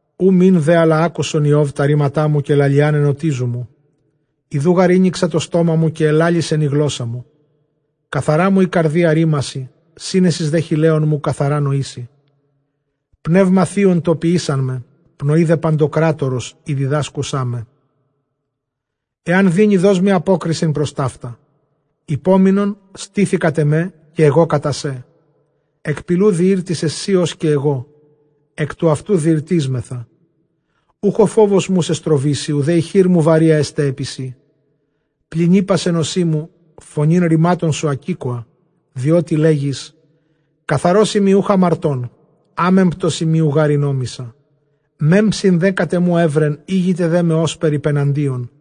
Οὐ μὴν δὲ ἀλλὰ ἄκουσου Ἰὼβ τὰ ῥήματά μου, καὶ λαλιὰν ἐνωτίζου μου. γὰρ ἤνοιξα τὸ στόμα μου, καὶ ἐλάλησεν ἡ γλῶσσά μου. Καθαρά μου ἡ καρδία ῥήμασι, σύνεσις δὲ χειλέων μου καθαρὰ νοήσει. Πνεῦμα θεῖον τὸ ποιῆσάν με, πνοὴ δὲ παντοκράτορος ἡ διδάσκουσά με. Ἐὰν δύνῃ, δός μοι ἀπόκρισιν, πρὸς ταῦτα ὑπόμεινον, στῆθι κατʼ ἐμὲ, καὶ ἐγὼ κατὰ σέ. Ἐκ πηλοῦ διήρτισαι σὺ ὡς καὶ ἐγὼ, ἐκ τοῦ αὐτοῦ διηρτίσμεθα. Οὐχ ὁ φόβος μου σὲ στροβήσει, οὐδὲ ἡ χείρ μου βαρεῖα ἔσται ἐπὶ σοί. Πλὴν εἶπας ἐν ὠσί μου· φωνὴν ῥημάτων σου ἀκήκοα· διότι λέγεις, καθαρός εἰμι οὐχ ἁμαρτών, ἄμεμπτός εἰμι, οὐ γὰρ ἠνόμησα· Μέμψιν δὲ κατʼ ἐμοῦ εὗρεν· ἥγηται δέ με ὥσπερ ὑπεναντίον.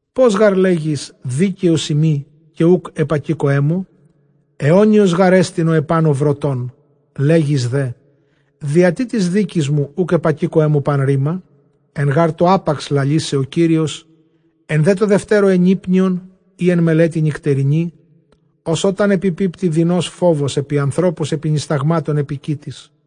Πῶς γὰρ λέγεις, δίκαιός εἰμι, καὶ οὐκ ἐπακήκοέ μου; αἰώνιος γάρ ἐστιν ὁ ἐπάνω βροτῶν. Λέγεις δέ, διατί τῆς δίκης μου οὐκ ἐπακήκοέ μου πᾶν ῥῆμα; Ἐν γὰρ τῷ ἅπαξ λαλήσαι ὁ Κύριος, ἐν δὲ τῷ δευτέρῳ. ἐνύπνιον ἢ ἐν μελέτῃ νυκτερινῇ, ὡς ὅταν ἐπιπίπτῃ δεινὸς φόβος ἐπʼ ἀνθρώπους, ἐπὶ νυσταγμάτων ἐπὶ κοίτης·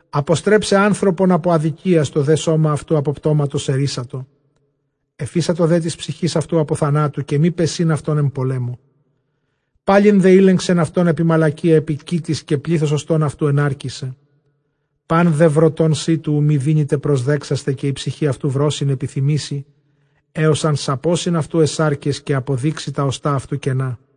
Ἀποστρέψαι ἄνθρωπον ἀπὸ ἀδικίας, τὸ δὲ σῶμα αὐτοῦ ἀπὸ πτώματος ἐῤῥύσατο. Ἐφείσατο δὲ τῆς ψυχῆς αὐτοῦ ἀπὸ θανάτου, καὶ μὴ πεσεῖν αὐτὸν ἐν πολέμῳ. Πάλιν δὲ ἤλεγξεν αὐτὸν ἐπὶ μαλακίᾳ ἐπὶ κοίτης, καὶ πλῆθος ὀστῶν αὐτοῦ ἐνάρκησε. Πᾶν δὲ βρωτὸν σίτου οὐ μὴ δύνηται προσδέξασθαι, καὶ ἡ ψυχὴ αὐτοῦ βρῶσιν ἐπιθυμήσει· ἕως ἂν σαπῶσιν αὐτοῦ αἱ σάρκες, καὶ ἀποδείξῃ τὰ ὀστᾶ αὐτοῦ κένα.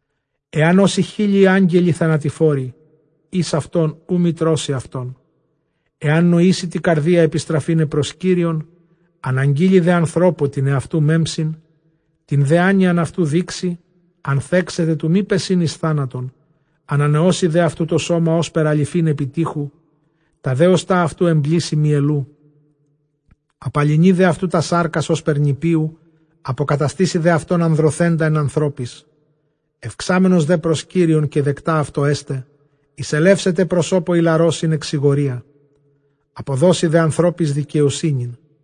Ἐὰν ὦσι χιλιοι αγγελοι θανατηφόροι, εἷς αὐτῶν οὐ μὴ τρώσῃ αὐτόν· ἐὰν νοήσῃ τῇ καρδίᾳ ἐπιστραφῆναι πρὸς Κύριον, ἀναγγείλῃ δὲ ἀνθρώπῳ τὴν ἑαυτοῦ μέμψιν, τὴν δὲ ἄνοιαν αὐτοῦ δείξῃ, ἀνθέξεται τοῦ μὴ πεσεῖν εἰς θάνατον· ἀνανεώσει δὲ αὐτοῦ τὸ σῶμα ὥσπερ ἀλοιφὴν ἐπὶ τοίχου, τὰ δὲ ὀστᾶ αὐτοῦ ἐμπλήσει μυελοῦ· Ἁπαλυνεῖ δὲ αὐτοῦ τὰς σάρκας ὥσπερ νηπίου, ἀποκαταστήσει δὲ αὐτὸν ἀνδρωθέντα ἐν ἀνθρώποις. Εὐξάμενος δὲ πρὸς Κύριον καὶ δεκτὰ αὐτῷ ἔσται, εἰσελεύσεται προσώπῳ ἱλαρῷ σὺν ἐξηγορίᾳ· ἀποδώσει δὲ ἀνθρώποις δικαιοσύνην.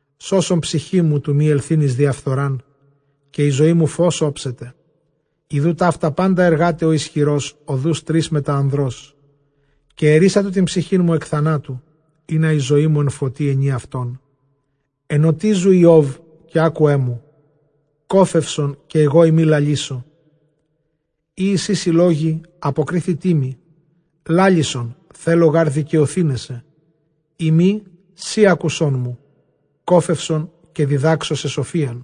Σῶσον ψυχήν μου τοῦ μὴ ἐλθεῖν εἰς διαφθορὰν, καὶ ἡ ζωή μου φῶς ὄψεται. Ἰδοὺ ταῦτα πάντα ἐργᾶται ὁ ἰσχυρὸς ὁδοὺς τρεῖς μετὰ ἀνδρός. Καὶ ἐῤῥύσατο τὴν ψυχήν μου ἐκ θανάτου, ἵνα ἡ ζωή μου ἐν φωτὶ αἰνῇ αὐτόν. Ἐνωτίζου Ἰὼβ καὶ ἄκουέ μου· κώφευσον, καὶ ἐγώ εἰμι λαλήσω. Εἰ εἰσί σοι λόγοι, ἀποκρίθητί μοι· λάλησον, θέλω γὰρ δικαιωθῆναί σε. Εἰ μὴ, σὺ ἄκουσόν μου, κώφευσον καὶ διδάξω σε.